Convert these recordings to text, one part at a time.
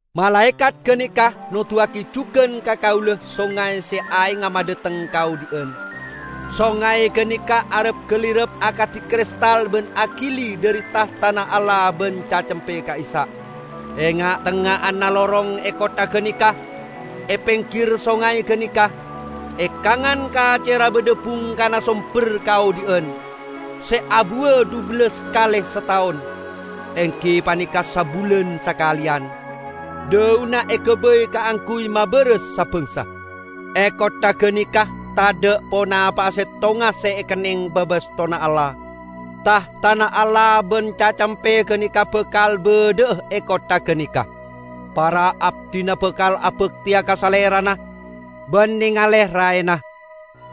Malaekat ganeka noduwagi jugan ka kaula songay se aengnga madhateng kaodhi'an. Songay ganeka arap-galirap akadi kristal ban agili dhari tahtana Allah ban Cacempe ka'issa', e nga'-tengnga'anna lorong e kottha ganeka. E penggir songay ganeka, e kangan kacerra badha bungkana somber kaodhi'an, se abuwa dhubellas kale sataon, enggi paneka sabulan sakaleyan. Dhaunna egabay kaangguy mabaras sa-bangsa. E kottha ganeka tadha' ponapa'a settonga se ekenneng babastonna Allah. Tahtana Allah ban Cacempe ganeka bakal badha'a e kottha ganeka. Para abdina bakal abakteya ka Salerana, ban nengale raena.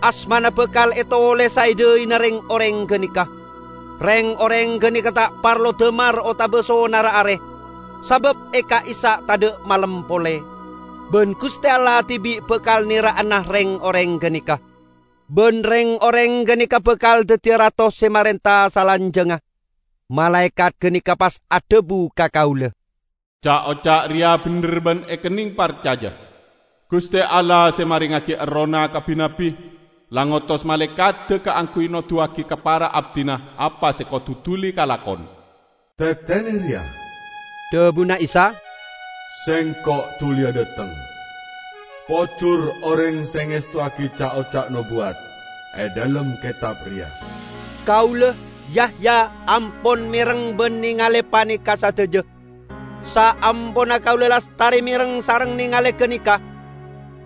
Asmana bakal etolesa e dhaina reng-oreng ganeka. Reng-oreng ganeka ta' parlo damar otaba sonarra are, sabab e ka'issa' tadha' malem pole, ban Guste Allah dibi' bakal nera'ana reng-oreng ganeka. Ban reng-oreng ganeka bakal daddiya rato se marenta salanjangnga. Malaekat ganeka pas adhabu ka kaula, "Ca'-oca' reya bendher ban ekenneng parcaja. Guste Allah se marengngagi Errohna ka bi-nabbi, la ngotos malaekadda kaangguy noduwagi ka para abdina apa se kodu duli kalakon." "Tetene reya!" dhabuna Isa, "Sengko' duliya dhateng! Pojur oreng se ngestowagi ca'-oca' nobuwat e dhalem ketab reya!" Kaula, Yahya, ampon mereng ban nengale paneka sadaja. Saamponna kaula lastare mereng sareng nengale ganeka,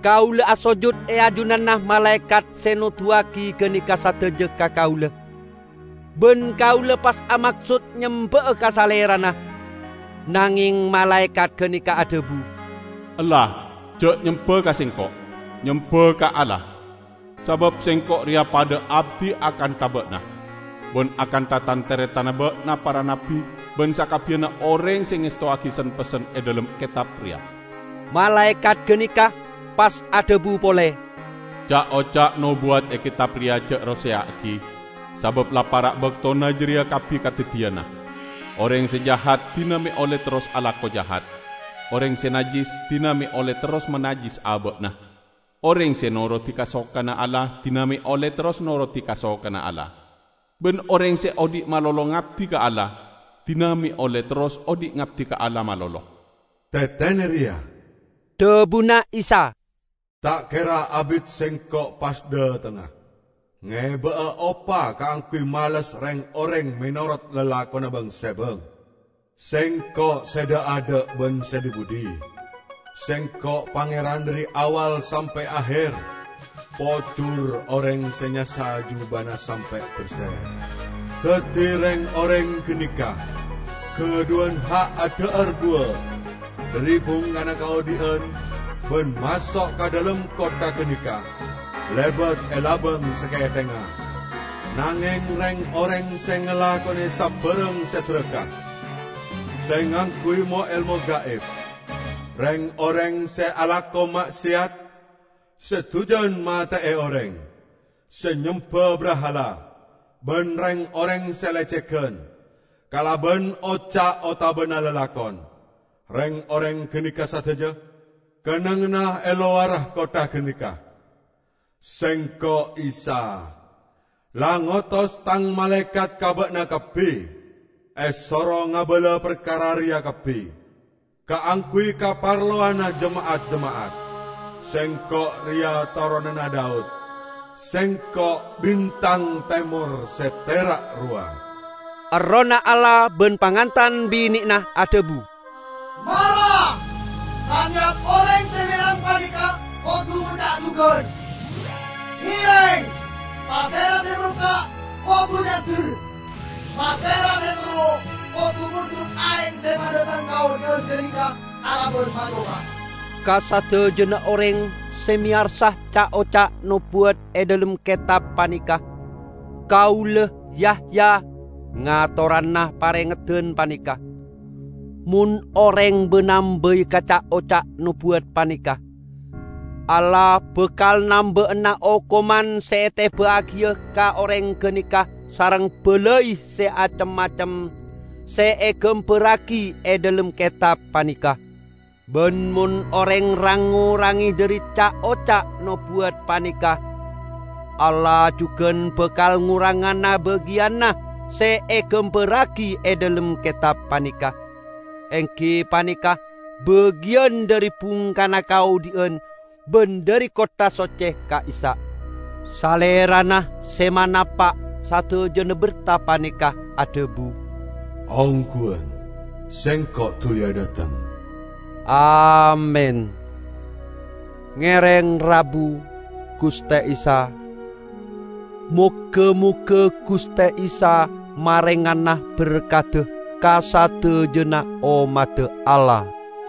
kaula asojut e ajunanna malaekat se noduwagi ganeka sadaja ka kaula, ban kaula pas amaksod nyemba'a ka salerana, nangeng malaekat ganeka adhabu "Ella! Ja' nyemba ka sengko'! Nyemba ka Allah! Sabab sengko' reya padha abdi akantha ba'na, ban akantha tan-taretanna ba'na para nabbi ban sakabbiyanna oreng se ngestowagi sen-pessen e dhalem ketab reya!" Malaekat ganeka pas adhabu pole, "Ca'-oca' nobuwat e ketab reya ja' roseya'agi, sabab la para' baktona jareya kabbi kadaddiyana. Oreng se jahat, dina me' olle terros alako jahat; oreng se najjis, dina me' olle terros manajjis aba'na; oreng se norodi kasokanna Allah, dina me' olle terros norodi kasokanna Allah, ban oreng se odhi' malolo ngabdi ka Allah, dina me' olle terros odhi' ngabdi ka Allah malolo." "Tetene reya!" dhabuna Isa. "Ta' kera abit Sengko' pas dhatengnga ngeba'a opa kaangguy males reng-oreng menorot lalakonna bang-sebang. Sengko' se dha'-adha' ban se dhi-budhi; Sengko' Pangeran dhari Awwal sampe' Aher." Pojur oreng se nyassa jubana sampe' berse, daddi reng-oreng ganeka gadhuwan ha' adha'ar buwa dhari bungkana kaodhi'an ban maso' ka dhalem kottha ganeka lebat e labang sakethengnga. Nangeng reng-oreng se ngalakone sabarang se daraka, se ngangguy mo-elmo gaib, reng-oreng se alako ma'seyat, se dujan mate'e oreng, se nyemba brahala, ban reng-oreng se lecegan, kalaban oca' otabana lalakon, reng-oreng ganeka sadaja kennengnganna e lowarra kottha ganeka. "Sengko', Isa, la ngotos Tang malaekat ka ba'na kabbi esoro ngabala parkara reya kabbi kaangguy kaparlowanna jema'at-jema'at. Sengko' reya toronanna Daud; Sengko' bintang temor se tera' rowa." Errohna Allah ban Pangantan Bine'na adhabu, "Mara!" Saneyap oreng se mereng paneka kodu ngoca' jugan, "Ngereng!" Pasera se pelka', kodu nyander! Pasera se terro, kodu mondhut aeng se madhateng kaodhi'an ganeka kalaban ma-coma. Ka sadajana oreng se meyarsa ca'-oca' nobuwat e dhalem ketab paneka, kaula, Yahya, ngatorana parengeddan paneka: mon oreng ba-nambai ka ca'-oca' nobuwat paneka, Allah bakal namba'ana okoman se eteba'agiya ka oreng ganeka sareng balai se acem-macem se egambarragi e dhalem ketab paneka. Ban mon oreng rang-ngorange dhari ca'-oca' nobuwat paneka, Allah jugan bakal ngorangana bagiyanna se egambarragi e dhalem ketab paneka -- enggi paneka bagiyan dhari bungkana kaodhi'an ban dhari kottha socce ka'issa'. Salerana se manapa' sadajana berta paneka adhabu, "Ongguwan, Sengko' duliya dhateng!" Amin! Ngereng rabu, Guste Isa! Moga-moga Guste Isa marengana berkadda ka sadajana ommadda Allah!